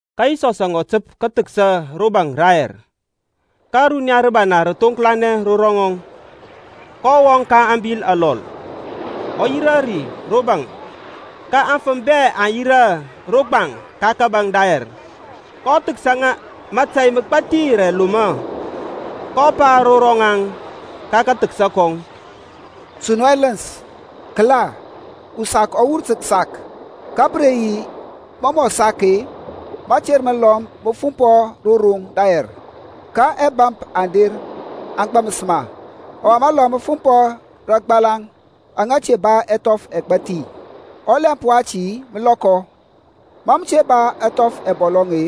Ka Yisɔsȧŋ ɔ təp sɔ kəthəksa ro baŋ rayɛr. Ka runiya rəbana rə thoŋklanɛ ro ŋɔŋ, kɔ wɔŋ ka abil alɔl, ɔ yirȧ ri ro baŋ ka aŋfəm bɛ aŋ yirȧ ro gbaŋ ka kȧbȧŋ dayɛr. kɔ thəksa ŋa mȧtȧy məgbathi rə ɛlomɔ, kɔ pa ro rɔŋaŋ ka kathəksa kɔŋ, Su nu ɛləns. Kəla, usak ɔ wur tə kəsak, ka pə re yi, mɔ mɔ sak-e, məter məlɔm mə fumpɔ ro roŋ dayɛr, ka ɛbȧmp aŋ der aŋ gbaməs ma. Ɔwa məlɔm mə fumpɔ rə agbalaŋ aŋa te ba ɛthɔf ɛgbathi. Ɔlɛmp wati mə lɔkɔ, ma mə te ba ɛthɔf ɛbɔlɔŋ-e,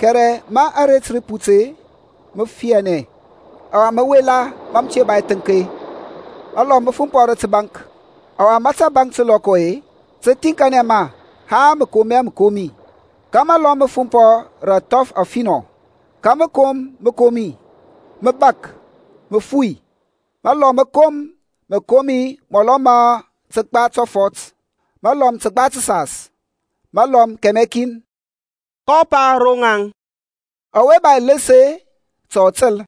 kɛrɛ ma aret rə put-e, mə fianɛ, ɔwa mə wela ma mə te ba ɛthəŋk. Məlɔm mə fumpɔ rə təbaŋk, ɔwa ma tabaŋk tə lɔkɔ-e, tə thiŋkanɛ ma haŋ mə kom hɛ məkomi. Ka məlɔm mə fumpɔ rə athɔf afinɔ, ka mə kom məkomi, mə bȧk, mə fui. Məlɔm mə kom məkomi mɔlɔ ma kəgba tɔfɔt, məlɔm təgba təsas, məlɔm kɛmɛ kin. kɔ pa ro ŋaŋ, Ɔwe ba ɛləns ta ɔ təl.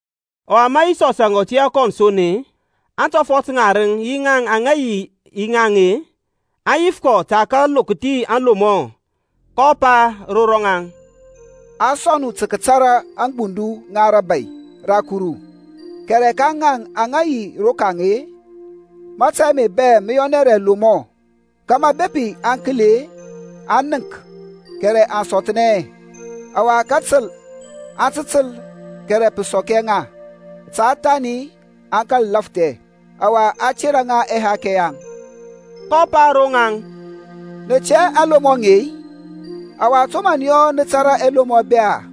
Ɔwa ma Yisɔsȧŋ ɔ tiyȧ kɔn son-e, aŋtɔfɔt ŋarəŋ yi aŋa yi yi ŋaŋ-e, aŋ yif kɔ tə kəlokthia ŋa aŋlomɔ. kɔ pa ro ŋaŋ, A sɔŋ nu tə kətara aŋgbundu ŋa rȧbȧy ra Kuru, kɛrɛ ka ŋaŋ aŋa yi rokaŋ-e, mȧtȧy ame bɛ mə yɔnɛ rə ɛlomɔ, kȧmȧ bepi aŋ kəli-e aŋ nənk kɛrɛ aŋ sɔthnɛ hɛ. Ɔwa kətəl aŋ tə təl kɛrɛ pə sɔk hɛ ŋa; ta thani aŋ kȧl lafthɛ, ɔwa a tera ŋa ɛhakɛ yaŋ. kɔ pa ro ŋaŋ, Nə tɛ hɛ aŋlomɔ aŋe-i? Ɔwa to mə nə yɔ nə tȧrȧ ɛlomɔ bɛ-a?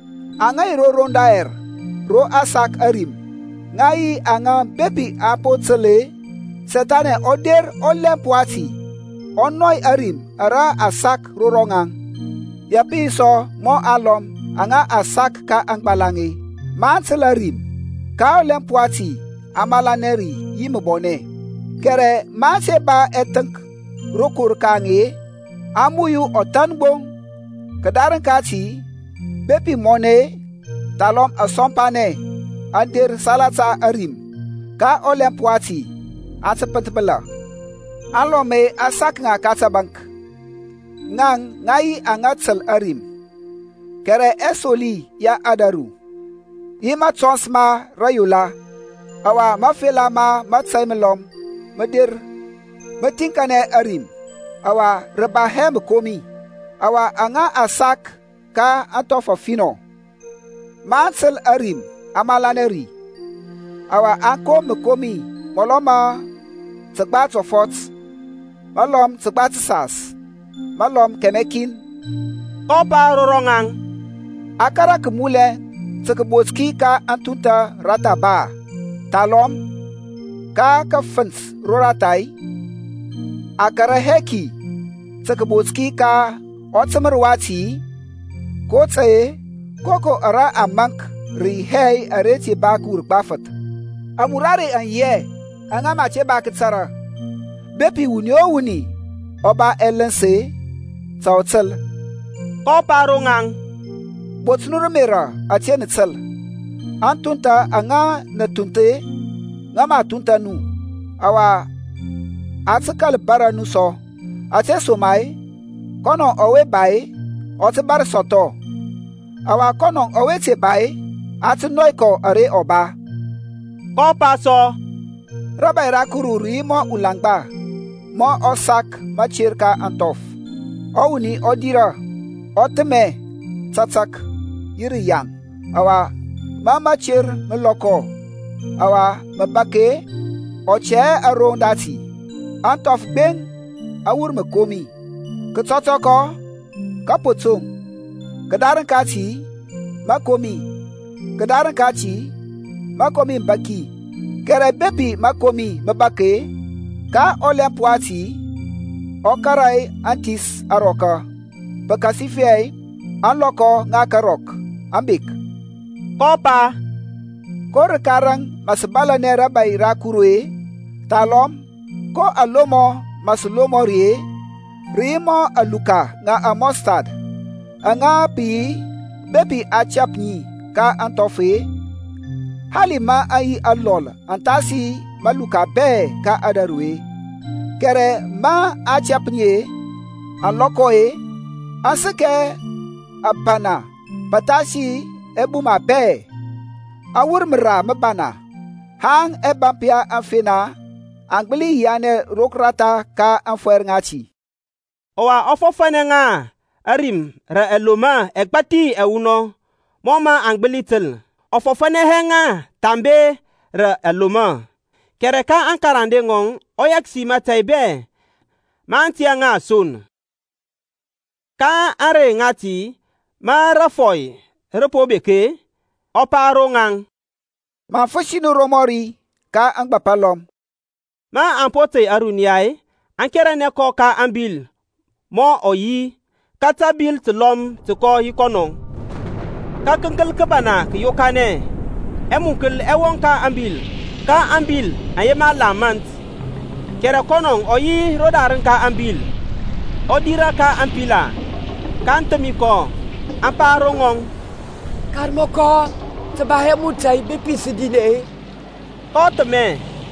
Aŋa yi ro roŋ dayɛr ro a sak ȧrim, ŋa yi aŋa bepi aŋ po təl-e, Sethani ɔ der ɔlɛmp wati ɔ nɔy ȧrim ara a sak ro rɔŋaŋ. Ya pə yi sɔ mɔ aŋlɔm aŋa a sak ka aŋgbalaŋ-e, maŋ təl ȧrim, ka ɔlɛmp wati aŋ malanɛ ri yi məbɔnɛ, kɛrɛ maŋ te ba ɛthəŋk rokor ka ŋaŋ-e, aŋ muyu ɔthan gbo; kədarəŋ kati bepi mɔnɛ-e, thalɔm asɔmpanɛ aŋ der salata ȧrim, ka ɔlɛmp wati aŋ tə pənthbəla. Alɔm-e, a sak ŋa ka tabaŋk. Ŋaŋ ŋa yi aŋa təl ȧrim, kɛrɛ ɛsoli ya ȧdȧru, yi matɔns ma rəyola, ɔwa mafela ma mȧtȧy məlɔm mə der-e, mə thiŋkanɛ ȧrim, ɔwa rə ba hɛ məkomi. Ɔwa aŋa a sak ka ȧŋthɔf afinɔ, maŋ təl ȧrim aŋ malanɛ ri, ɔwa aŋ kom məkomi mɔlɔ ma kəgba tɔfɔt, məlɔm təgba təsas, məlɔm kɛmɛ kin. kɔ pa ro rɔŋaŋ, A kȧrȧ kəmulɛ tə kəbot ki ka ȧthunthȧ roratha ba, thalɔm ka kəfənt roratha-i, a kȧrȧ hɛ ki tə kəbot ki ka ɔtəmər wati-i? kotȧy-e koko ara a maŋk rə yi hɛ ara mə a te ba kəwur gbafəth; amurare aŋ yi hɛ aŋa mə a te ba kətara. Bepi wuni o wuni ɔ ba ɛləns-e, ta ɔ təl. kɔ pa ro ŋaŋ, Bot nu rə ȧmerȧ ȧte nə təl. Anthuntha aŋa nə thunth-e, ŋə mə a thuntha nu. Ɔwa a tə kȧl bȧrȧ nu sɔ. Ȧtesoma-e kɔnɔ ɔwe ba-e, ɔ tə bȧr sɔthɔ, ɔwa kɔnɔ ɔwe te ba-e, a tə nɔy kɔ ara ɔ ba. kɔ pa sɔ, Rȧbȧy ra Kuru rə yi mɔ ulaŋgba mɔ ɔ sak məter ka ȧŋthɔf. Ɔwuni ɔ dirȧ, ɔ thəmɛ tȧtȧk yi rəyaŋ, ɔwa ma mater mə lɔkɔ, ɔwa mə bȧk-e, ɔ tɛ hɛ aroŋ dati. Aŋthɔf gbeŋ aŋ wur məkomi; kətɔtɔkɔ kȧpotoŋ. Kədarəŋ kati mȧkomi, kədarəŋ kati mȧkomi məbaki. Kɛrɛ bepi mȧkomi mə bȧk-e, ka ɔlɛmp wati ɔ kȧrȧ aŋthis arɔka, pəkasifɛ ȧŋlɔkɔ ŋa karɔk aŋ bek. kɔ pa, Ko rəka raŋ mə sə bȧlȧnɛ rȧbȧy ra Kuru-e? Thalɔm ko alomɔ mə sə lomɔ ri-e? Rə yi mɔ aluka ŋa amustard, aŋa pə yi bepi a tɛp ŋi ka aŋthɔf-e, hali maŋ yi alɔl athasi maluka bɛ ka ȧdȧru-e kɛrɛ ma a tɛp ŋi-e, aŋ lɔkɔ-e, aŋ səkɛ ȧbana pəthasi ɛbuma bɛ, aŋ wur məra məbana, haŋ ɛbȧmp ya aŋfena aŋ gbəli yianɛ roratha ka ȧŋfɔyr ŋati. Ɔwa ɔ fɔfȧnɛ ŋa ȧrim rə ɛlomɔ ɛgbathi ɛwunɔŋ, mɔ mə aŋ gbəli təl. Ɔ fɔfȧnɛ hɛ ŋa thambe rə alomɔ, kɛrɛ ka aŋkarande ŋɔŋ ɔ yɛksi mȧtȧy bɛ, maŋ tiyȧ ŋa son. Ka ȧŋrey ŋati ma rȧfɔy rə po bek-e, ɔ pa ro ŋaŋ, Maŋ fəsi nu romɔri ka ȧŋgbȧp alɔm. Maŋ po tey ȧruniya-e aŋ keranɛ kɔ ka ȧŋbil mɔ ɔ yi. Ka təbil təlɔm tə kɔ yi kɔnɔ. Ka kəŋkəl kəbana kə yokanɛ, ɛmunkəl ɛ wɔŋ ka ȧŋbil, ka ȧŋbil aŋ yema la mȧnt. Kɛrɛ kɔnɔ ɔ yi rodarəŋ ka ȧŋbil-e, ɔ dirȧ ka ȧŋpila, kaŋ thəmi kɔ, aŋ pa ro ŋɔŋ, Karmɔkɔ, tə ba hɛ mu tȧy bepi sə dinɛ-i? kɔ thəmɛ,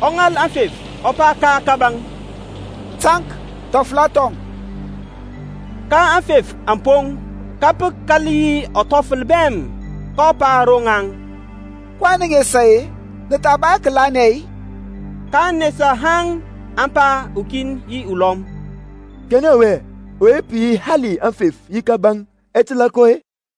ɔ ŋal aŋfef, ɔ pa ka kȧbȧŋ, Taŋk, thɔfəla thɔŋ. Ka aŋfef aŋ poŋ, ka pə kȧl yi ɔthɔfəl bɛm. kɔ pa ro ŋaŋ, kɔyɛŋ nə nesa-e? Nə tha ba hɛ kəlanɛ-i? kaŋ nesa haŋ aŋ pa ukin yi ulɔm, Kanɛ yi ɔwe-e, ɔwe pə yi hali aŋfef yi kȧbȧŋ, ɛ təlȧ kɔ-e?